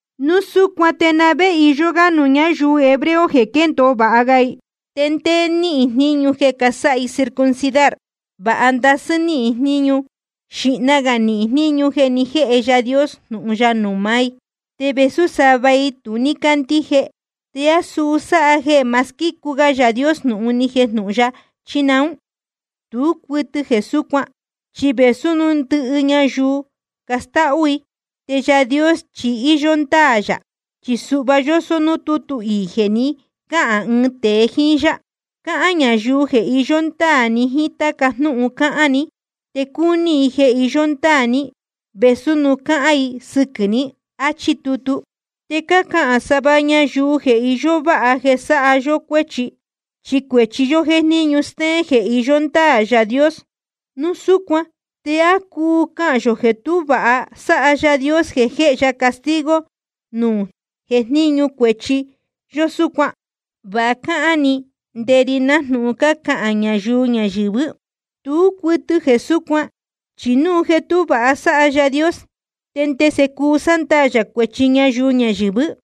¿Núu súcuan te na vé iyó gá nuū ñáyuu hebreo jeē quéndōo vāha ga i? ¿Te ndé níhín jníñu jeē casáha i circuncidar? Vāha ndasɨ́ níhín jníñu. Xīhna gā nihín jníñu jeē ni jéhe Yaā Dios jnūhun ya nuū maá i. Te vēsú sava i tu ní cácandíje, ¿te á suu sáha jeē ma squícu ga Yaā Dios jnūhun ni jejnūhun ya, chí naún? Tú cuɨtɨ jeē súcuan, chi vēsú núu ndɨhɨ ñayuu castáhú i, te Yaā Dios chi íyó ndáā yā. Chi suhva yósó nuū tútu iī jeē ni cáhān ɨɨn tēe jíín yá: Cahān ñayuu jeē iyó ndáā ni jíín táca jnúhun cáhán ni, te cuni i jeē iyó ndáā ní vēsú núu cácahān i sɨquɨ̄ ní. Achí tutu. Te cácahān sava ñayuu jeē iyó váha jeē sáha yó cuéchi, chi cuēchi yó jéjníñu stéén jeē iyó ndáā Yaā Dios. Núu súcuan ¿te á cuu cahān yō jeē tú vāha sáha Yaā Dios jeē jéhe ya castigo núu jéjníñu cuēchi yó súcuan? (Va cáhán‑ni nde ri nájnūhun cácahān ñayuu ñayɨ̄vɨ́.) Tú cuɨtɨ jeē súcuan. Chi núu jeē tú vāha sáha Yaā Dios, ¿te ndese cuu sándaā yā cuēchi ñayuu ñayɨ̄vɨ́?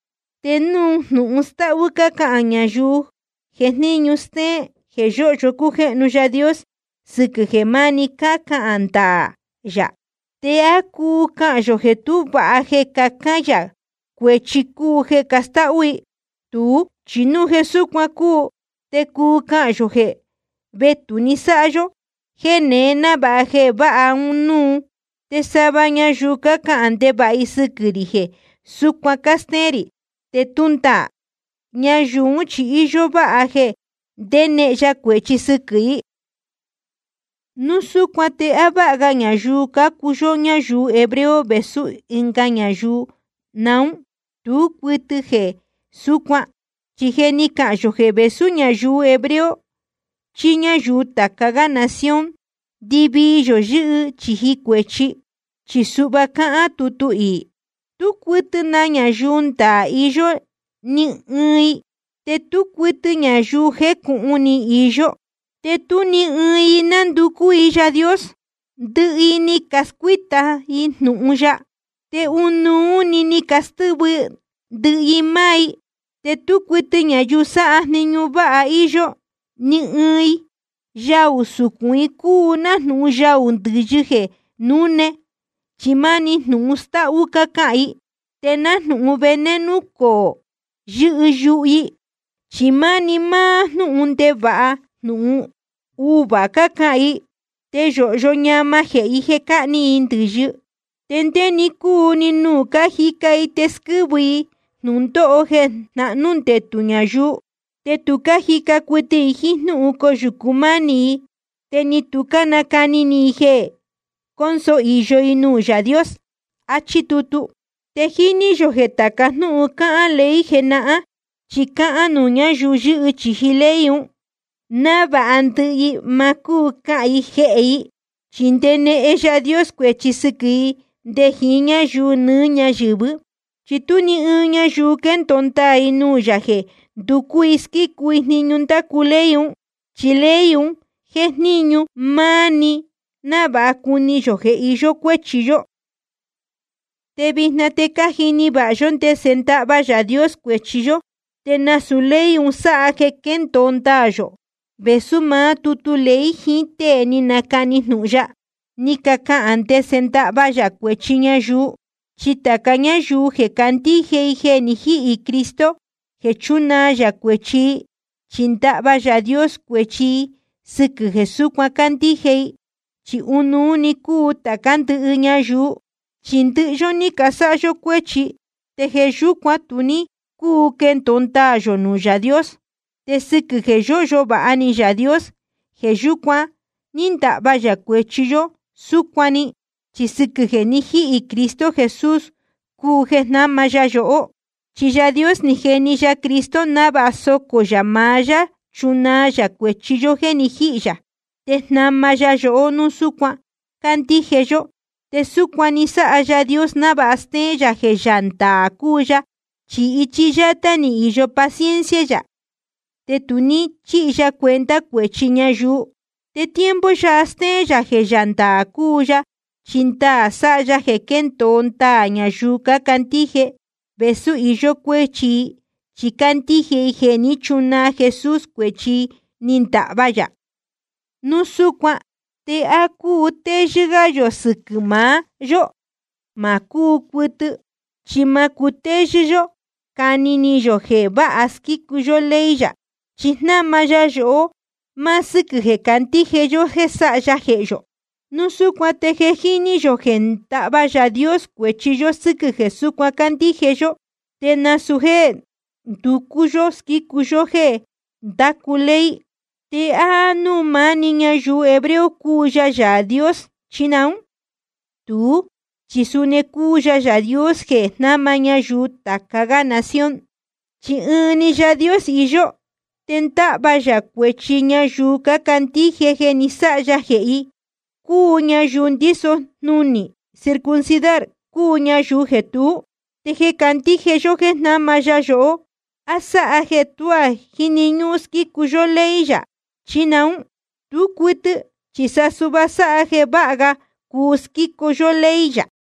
Te núu jnūhun stáhú cácahān ñayuu jéjníñu stéén jeē yóhyo cújéhnu Yaā Dios sɨquɨ̄ jeē máni cáhán ndaā yā, ¿te á cuu cahān yō jeē tú vāha jeē cahán yā jeē cuēchi cúu jeē castáhú i? Tuú, chi núu jeē súcuan cúu, te cuu cahān yō jeē vetū‑ni sáha yó jéē neé návāha quee jeē váha núú. Te sava ñayuu cácahān ndevāha i sɨquɨ̄ rī jeē súcuan cástéén rī, te tú ndaā. Ñayuu ún chi íyó váha jeē ndénehen ya cuēchi sɨquɨ̄ i. Núu súcuan ¿te á váha ga ñayuu cácuu yóhó ñáyuu hebreo vēsú ɨnga ñayuu naún? Tú cuɨtɨ jeē súcuan. Chi je ni cacahān yō jeē vēsú ñayuu hebreo chí ñáyuu tāca gá nación, ndɨvii yō yɨ́hɨ chīji cuēchi. Chi suhva cáhán tutu iī: Tú cuɨtɨ na ñayuu ndaā iyó, ni ɨɨn i. Te tú cuɨtɨ ñayuu jécūhun ni iyó, te tú ni ɨɨn i nánducú i Yaā Dios. Ndɨhɨ i ni cascuíta i jnūhun ya, te ɨnuú‑ni ni castɨ́vɨ ndɨhɨ i máá i. Te tú cuɨtɨ ñayuu sáha jniñu váha íyó, ni ɨɨn i. Yaū sucūn i cúu nájnūhun yaū ndɨ̄yɨ jeē núne, chi máni jnūhun stáhú cácahān i. Te nájnūhun veneno coō yɨ́hɨ yuhu i, chi máni máá jnúhun ndevāha jnūhun uvuā cácahān i. Te yōhyo ñama jehē i jeē cáhni i ndɨ̄yɨ. Te ndé‑ni cúu‑ni nuū cájica i te squɨ́vɨ i jnūndóho jeē jnahnú ndetū ñayuu. Te tu cájica cuɨtɨ i jíín jnúhun coyūcu mánī i, te ni tu cánacani ni i jeē cónso īyo i nuū Yaā Dios. Achí tutu. Te jíní yō jeē tāca jnúhun cáhán ley jenahán, chi cáhán nuū ñáyuu yɨ́hɨ chīji ley un, návāha ndɨhɨ i ma cúu cahān i jehē i. Chi ndenehen Yaā Dios cuēchi sɨquɨ̄ i nde jiín ñáyuu nɨɨ́ ñáyɨ̄vɨ́. Chi tú ni ɨɨn ñayuu quendōo ndaā i nuū yā jeē nducú i squícu i jniñu ndácu ley un. Chi ley un jéjníñu máni návāha cuni yō jeē iyó cuéchi yó. Te vijna te je cájini vāha yó ndese ndáhva Yaā Dios cuēchi yó. Te nasūu ley un sáha jeē quéndōo ndaā yō, vēsú maá tutu ley jiín tée ni canacani jnūhun ya, ni cacahān ndese ndáhva yā cuēchi ñayuu. Chi tāca ñáyuu jeē cácandíje i jeē ni jíhī Jesucristo jeē chúnaa yā cuēchi i, chi ndahva Yaā Dios cuēchi i sɨquɨ̄ jeē súcuan cácandíje i. Chi ɨnuú‑ni cúu tācá ndɨhɨ ñayuu. Chi ndɨhɨ yó ni casáha cuēchi, te jeē yúcuan tu ní cúu quendōo ndaā yō nuū Yaā Dios. Te sɨquɨ̄ jeē yóhyo vāha ni Yaā Dios, jeē yúcuan ndáhva yā cuēchi yó súcuan‑ni. Chi sɨquɨ̄ jeē ni jíhī Cristo Jesús cúu jeē jnáma ya yohó. Chi Yaā Dios ni jeni ya Cristo návāha socō yā maá yá chunaa yā cuēchi yó jéē ni jíhī yā. Te jnáma ya yohó núu súcuan cándíje yó. Te súcuan ni sáha Yaā Dios návāha stéén yā jeē Yaā ndaā cúu ya. Chi ichi yátá ni īyo paciencia yā, te tu ní chíhi ya cuenta cuēchi ñayuu. Te tiempo yáha stéén yā jeē Yaā ndaā cúu ya, chi ndaā sáha ya jeē squéndōo ndaā yā ñayuu candíje vēsú íyó cuéchi i, chi cácandíje i jeē ní chunaa Jesús cuēchi i ni ndahva yā. Núu súcuan ¿te á cuu cutéyɨ́ gá yō sɨquɨ̄ maá yó? Ma cúu cuɨtɨ, chi ma cúu cutéyɨ́ yó cani ni yō jeē vāha squícu yó ley yā. Chi jnáma ya yohó máá sɨ́quɨ̄ jeē candíje yó jéē sáha ya jehē yō. Núu súcuan te je jíní yō jeē ndáhva Yaā Dios cuēchi yó sɨ́quɨ̄ jeē súcuan cándíje yó, te nasūu jéē nducú yó squícu yó jéē ndácu ley. ¿Te á núū maá‑ni ñayuu hebreo cúu ya Yaā Dios, chí naún? Tuú, chi suni cúu ya Yaā Dios jeē jnáma ñayuu tāca gá nación. Chi ɨɨn‑ni Yaā Dios iyó, te ndáhva yā cuēchi ñayuu cácandíje jeē ni sáha ya jehē i, cúu ñayuu ndíso jnunī circuncidar, cúu ñayuu jeē tuú. Te jeē candíje yó jéē jnáma ya yohó, ¿á sáha jeē tuá jíni ñúhún squícu yó ley yā, chí naún? Tú cuɨtɨ, chi sa suhva sáha jeē váha ga cuu squícu yó ley yā.